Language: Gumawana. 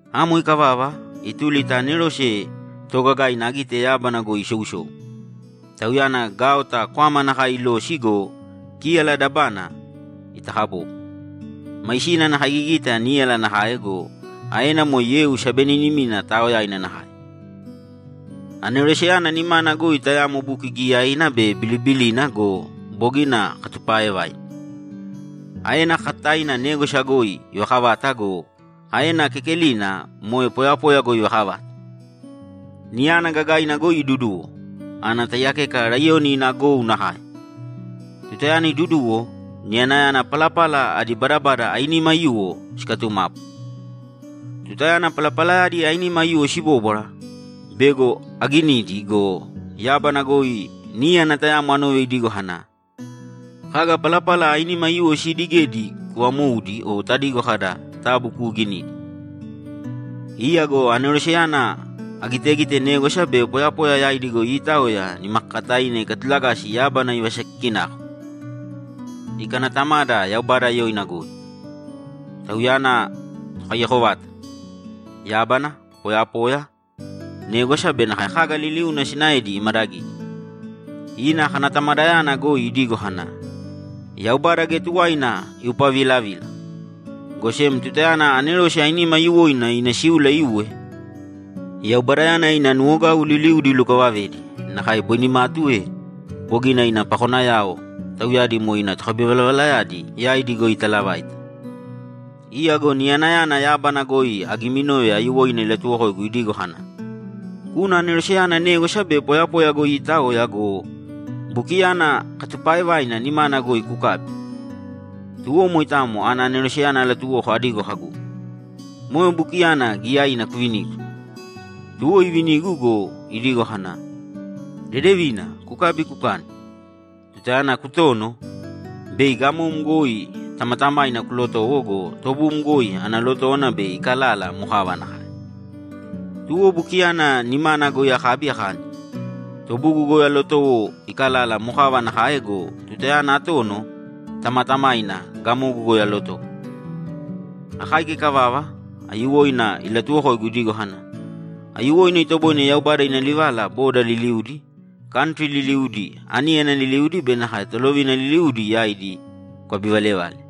Amo ikavava, ituli ta anerose toogagaina agite yábana goi isousou. Tauyana gaota kwama nakae ilosi go, kíyala dabana itakabobo. Maisina ana kaigigita níyala nakae go, aena moe yeu sabeninimina taaoyaina nakae. Aneroseyana nimana goi tayamo buki giyaina be bilibilina go, bogina katupaaevaina. Aena kakataina négwasa goi ivakavata go, aena kekelina moe poyapoya goi ivakavata. Niyana gagaina goi iduduwo, ana taiyakeka laiyoni ina gou nakae. Tutayana iduduwo, niyanayana palapala adi badabada ainima aiyuwo sikatumapu. Tutayana palapalayadi ainima aiyuwo sibóbwara, bego aginidi go, yábana goi níyana tayamo anove idigo kana, ‘Kaga palapala ainima aiyuwo siidigedi kuvamōudi o tadigo kada, “Tabu kuuginīdi.”’ Iya go aneroseyana agitegite négwasa be poyapoya yaidi goi iitaoya nimakakataina ikatulagasi yábana ivasakikinako, ikanatamada Yaubada yoina goi; Tauyana Tokaiyako vata. Yábana, poyapoya, négwasa be nakae kaga liliuna sinaedi imadagidi. Ina kanatamadayana goi idigo kana, ‘Yaubada geya tuwaina iupavilavila, go sem tutayana anerose ainima aiyuwoina ina síula iuwe, Yaubadayana ina nuwogau liliudi ilukavavedi, nakae boi nimatu ee, bogina ina pakonayao, tauyadi moe ina tokabivalavalayadi, yaidi goi italavaita.’ Iya go niyanayana yábana goi agiminove aiyuwoina ilatuwokoigu idigo kana, ‘Kūna aneroseyana négwasa be poyapoya goi iitaoya go, bukiyana katupaaevaina nimana goi kukābi.’ Tuwo moitamo ana aneroseyana alatuwoko adigo kagu, ‘Moe bukiyana giyaina kuvinīgu.’ Tuwo ivinigu go, idigo kana, ‘Dedevina, kukābi, kukāni. Tutayana kutono, bei gamom goi tamatamaina kulotowo go, tobum goi ana lotówana bei ikalala mokava nakae.’ Tuwo bukiyana nimana goi akabi akani. Tobugu goi alotowo ikalala mokava nakae go, tutayana atono, tamatamaina gamogu goi alotowo. Akáika ikavava, aiyuwoina ilatuwokoigu idigo kana, ‘Aiyuwoina itoboine Yaubada ina livala boda liliudi, kantri liliudi, aníyana liliudi be nakae tolovina liliudi yaidi kukabivalevale.’